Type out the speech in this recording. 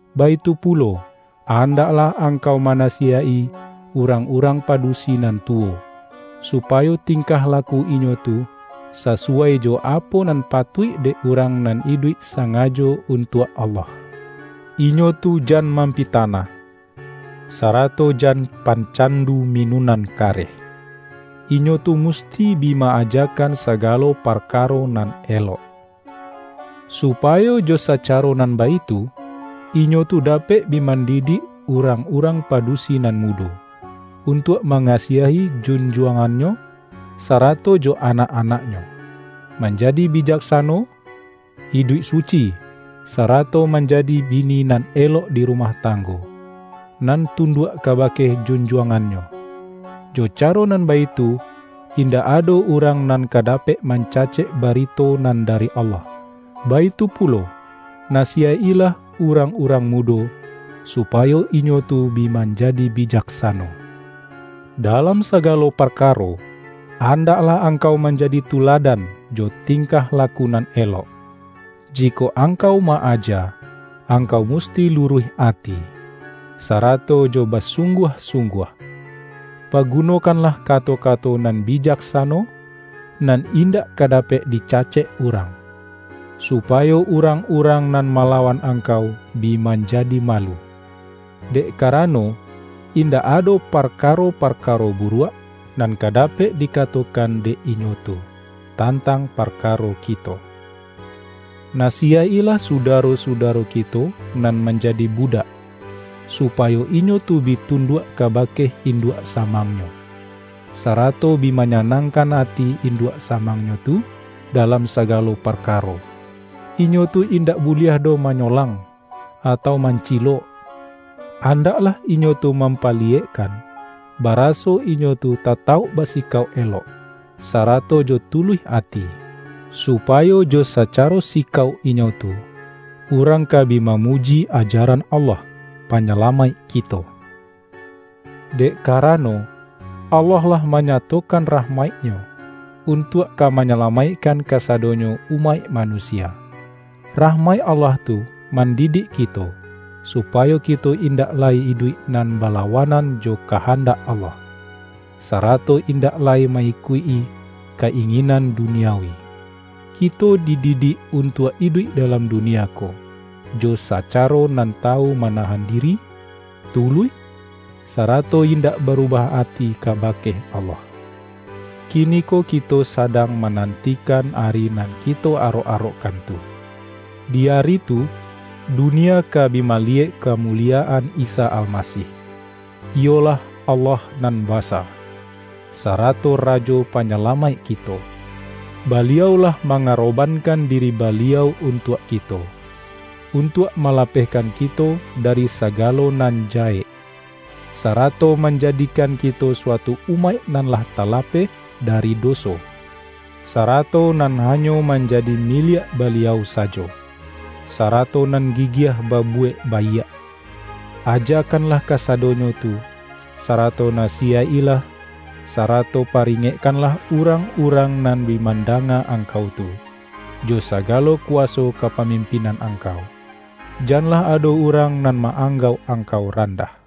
Baitu pulo, andaklah angkau manasiyaik-i urang-urang padusi nan tuwo, supayo ting-kah laku inyo tu, sasuwai jo apo nan patuik dek urang nan iduik sangajo untuak Allah. Inyo tu jan mampita-nah, sarato jan pancandu minunan kareh. Inyo tu musti bi ma-ajakan sa-galo parkaro nan elok, supayo jo sa-caro nan baitu, inyo tu dapek bi man-didik urang-urang padusi nan mudo, untuak mangasiahi junjuangannyo, sarato jo anak-anaknyo, manjadi bi-jaksano, iduik suci, sarato manjadi bi-ni nan elok di rumah tanggo, nan tun-duak kabake junjuangannyo. Jo caro nan baitu, indak ado urang nan ka da-pek mancacek barito nan dari Allah. Baitu pulo, nasiyaik-ilah urang-urang mudo, supayo inyo tu bi man-jadi bijaksano. Dalam sagalo parka-ro, andaklah angkau manjadi tuladan jo tingkah laku nan elok. Jikok ang-kau ma-aja, angkau musti luruih ati, sarato jo basungguah-sungguah. Pagunokanlah kato-kato nan bijak-sano, nan indak ka dapek dicacek urang, supayo urang-urang nan ma-lawan angkau bi manjadi malu, dek karano, indak ado parkaro-parkaro buruak, nan ka dapek dikatokan dek inyo tu tantang parkaro kito. Nasiyaik-ilah sudaro-sudaro kito nan manjadi budak, supayo inyo tu bi tunduak kabake induak samangnyo, sarato bi manyanangkan ati induak samangnyo tu dalam sagalo parka-ro. Inyo tu indak buliah doh manyo-lang, atau mancilok. Andaklah inyo tu mampaliyekkan, baraso inyo tu ta-tauk basikauk elok, sarato jo tuluih ati, supayo jo sacaro sikauk inyo tu, urang ka bi mamuji ajaran Allah, Pa-nyalamaik kito. Dek karano, Allah lah manyato-kan rahmaik-Nyo, untuak ka manya-lamaikkan kasadonyo umaik manusia. Rahmaik Allah tu mandidik kito, supayo kito indak lai iduik nan bala-wanan jo kahandak Allah, sarato in-dak lai ma-ikuik-i ka-inginan duniawi. Kito dididik untuak iduik dalam dunia ko, jo sacaro nan tawu manahan diri, tuluih, sarato indak barubah ati kaba-ke Allah. Kiniko kito sadang manan-tikan Ari nan kito arok-arokkan tu; di Ari tu, dunia ka bi maliyek kamuliyaan Isa Almasih, iyolah Allah Nan Basa, sa-rato Rajo Panyalamaik kito. Baliau lah mangarobankan diri Baliau untuak kito, untuak malapehkan kito dari sa-galo nan jahek, sarato manjadikan ki-to suatu umaik nan lah talapeh dari doso, sarato nan hanyo manjadi mi-liak Baliau sajo, sarato nan gigiah ba-buwek baiak. Ajakanlah kasadonyo tu, sarato nasiyaik-ilah, sarato paringekkanlah urang-urang nan bi mandanga angkau tu, jo sagalo kuwaso kapamimpinan angkau. Janlah ado urang nan ma-anggauk angkau randah.